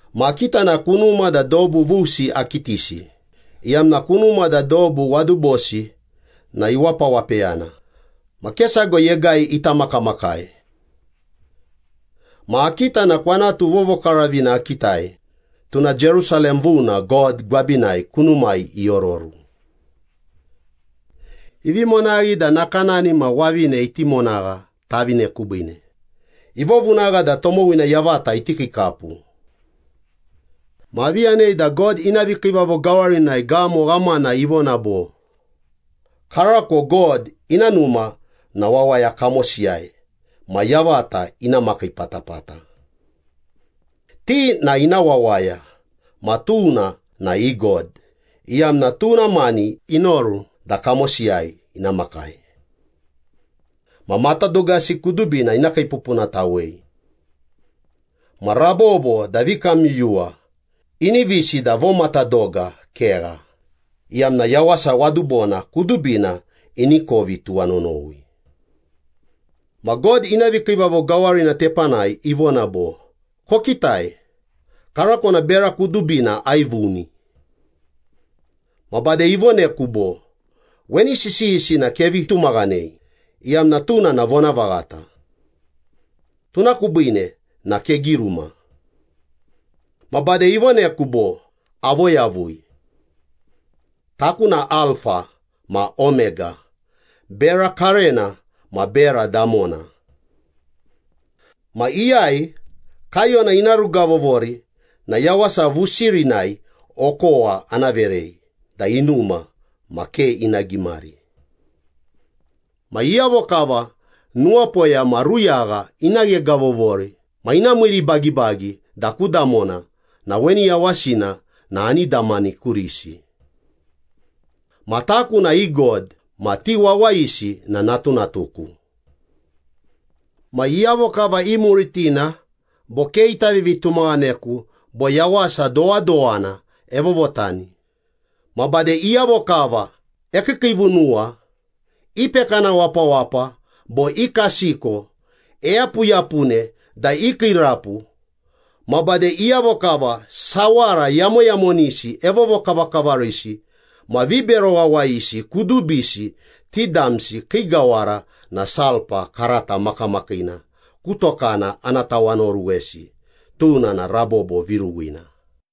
Ma akita na kunuma da dobu vusi akitisi, iyamna kunuma da dobu wadubosi na iwapawapeyana, ma ke sago yegai ita makamakai. Ma akita na kwanatu vovokaravina akitai, tuna Jerusalem vuna God gwabinai kunumai iororu. Ivi monaghi da nakanani ma wavine iti monagha tavine kubiine, ivovunagha da tomowina yavata iti kiikapu. Ma avi yanei da God ina vikiivavo gawarinai gamo ghamana ivona bo, “Karako God ina numa na wawaya kamosiyai ma yavata ina makii patapata. Ti na ina wawaya, ma tuna na i God, iyamna tuna mani inoru da kamosiyai ina makai. Ma matadogasi kudubina ina kiipupunatawei. Ma rabobo da vikamyuyuwa, inivisi da vomatadoga kegha, iyamna yawasa wadubona kudubina ini kovi tuwanonowi.” Ma God ina vikiivavo gawarina tepanai ivona bo, “Kokitai, karako na bera kudubina aivuni.” Ma bade ivoneku bo, “Weni sisiyisi na kevi tumaghanei iyamna tuna na vonavaghata. Tuna kubiine na kegiruma.” Ma bade ivoneku bo, “Avoyavui. Taku na Alfa ma Omega, bera karena ma bera damona. Ma iyai kaiyona ina rugavovori na yawasa vusirinai okowa ana verei da inuma ma ke ina gimari. Ma iyavo kava nuwapoya ma ruyagha ina ghegavovori ma ina miiribagibagi da ku damona na weni yawasina na ani damani kurisi. Ma taku na i God ma ti wawayisi na natunatuku. Ma iyavo kava imuritina bo ke ita vivitumaghaneku bo yawasa dowadowana evovotani, ma bade iyavo kava ekiikiivunuwa, ipekana wapawapa bo ikasiko, eyapuyapune da ikiirapu, ma bade iyavo kava sawara yamoyamonisi evovokavakavarisi ma vibero wawayisi kudubisi, ti damsi kii gawara na sulpa karata makamakiina ku tokana ana tawanaoruwesi, tuna na rabobo viruwina.”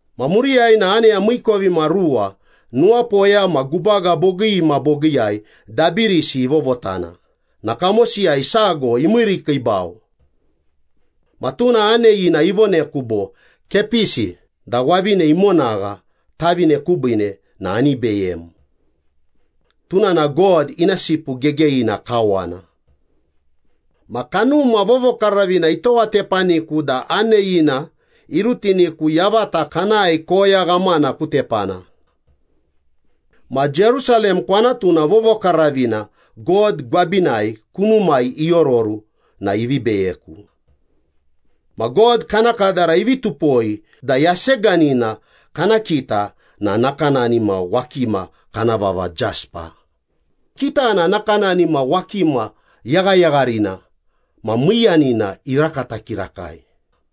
Ma muriyai na aneya miikovimaruwa nuwapoya ma gubaga bogii ma bogiiyai dabirisi ivovotana na kamosiyai sago imiirikiibau. Ma tuna aneyina ivoneku bo, “Kepisi da wavine imonagha tavine kubiine na ani beyem. Tuna na God ina Sipu Gegeyina kawana.” Ma Kanuma Vovokaravina itowatepaniku da aneyina irutiniku yavata kanae koya ghamana ku tepana. Ma Jerusalem kwanatuna vovokaravina God gwabinai kunumai iororu na ivi beyeku. Ma God kana kadara ivi tupoi da yaseganina kana kita na nakanani ma wakima kana vava jespa, kitana na nakanani ma wakima yaghayagharina ma miiyanina irakata kirakai.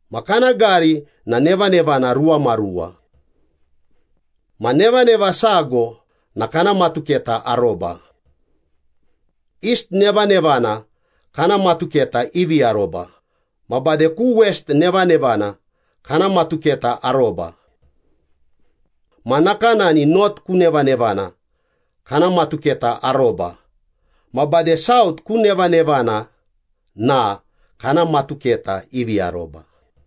Ma kana gari na nevanevana ruwamaruwa. Ma nevaneva sago na kana matuketa aroba. East nevanevana kana matuketa ivi aroba ma bade ku west nevanevana kana matuketa aroba. Ma nakanani north ku nevanevana kana matuketa aroba ma bade south ku nevanevana na kana matuketa ivi aroba.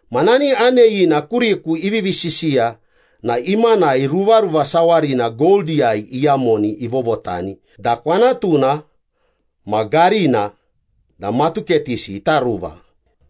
Ma nani aneyina kuriku ivivi sisiya na imanai ruvaruva sawarina goldiyai iyamoni ivovotani da kwanatuna ma garina da matuketisi ita ruva.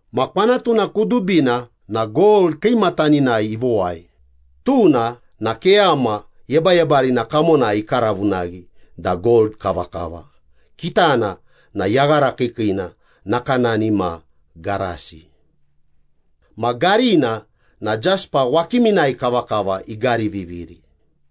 Ma kwanatuna kudubina na gold kiimataninai ivowai, tuna na keyama yebayebarina kamonai ikaravunaghi da gold kavakava, kitana na yaghara kiikiina nakanani ma garasi. Ma garina na jespa wakiminai kavakava igariviviri.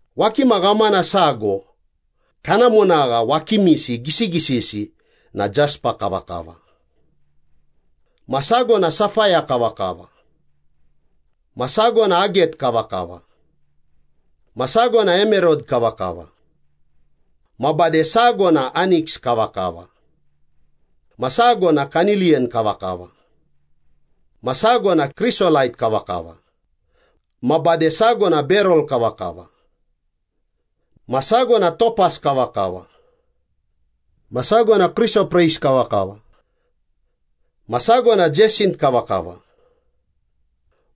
Wakima ghamana sago kana monagha wakimisi gisigisisi na jespa kavakava. Ma sago na safaya kavakava. Ma sago na aget kavakava. Ma sago na emerod kavakava. Ma bade sago na aniks kavakava. Ma sago na kaniliyan kavakava. Ma sago na krisolait kavakava. Ma bade sago na berel kavakava. Ma sago na topas kavakava. Ma sago na krisopreis kavakava. Ma sago na jeisint kavakava.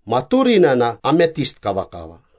Ma turina na ametist kavakava.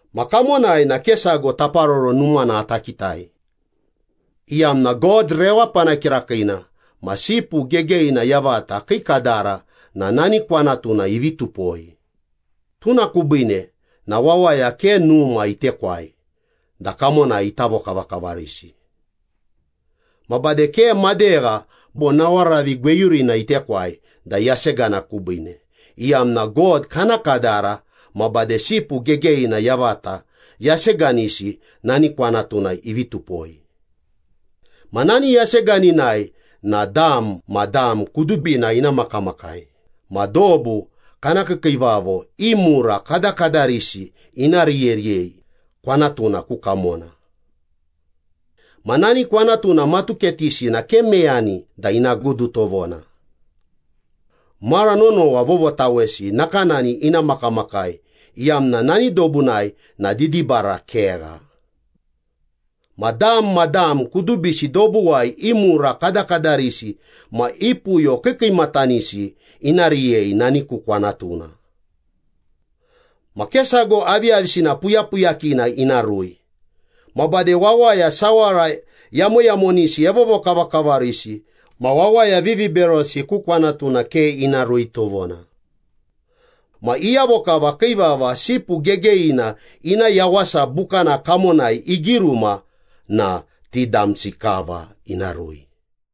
Ma kamonai na ke sago taparoro numana ata kitai, iyamna God rewapana kirakiina ma Sipu Gegeyina yavata kii kadara na nani kwanatuna ivi tupoi, tuna kubiine na wawaya ke numa itekwai da kamonai ita vokavakavarisi. Ma bade ke madegha bo nawaravi gweyurina itekwai da yasegana kubiine, iyamna God kana kadara ma bade Sipu Gegeyina yavata yaseganisi nani kwanatuna ivi tupoi. Ma nani yaseganinai na dam ma dam kudubina ina makamakai ma dobu kana kiikiivavo i mura kadakadarisi ina riyeriyei kwanatuna ku kamona. Ma nani kwanatuna matuketisi na ke meyani da ina gudu tovona. Mara nonowa vovotawesi nakanani ina makamakai iyamna nani dobunai na didibara kegha. Ma dam ma dam kudubisi dobuwai i mura kadakadarisi ma i puyo kiikiimatanisi ina riyei nani ku kwanatuna. Ma ke sago aviyavisina puyapuyakina ina rui. Ma bade wawaya sawara yamoyamonisi evovokavakavarisi ma wawaya viviberosi ku kwanatuna ke ina rui tovona. Ma iyavo kava kii vava Sipu Gegeyina ina Yawasa Bukana kamonai igiruma na ti damsi kava ina rui.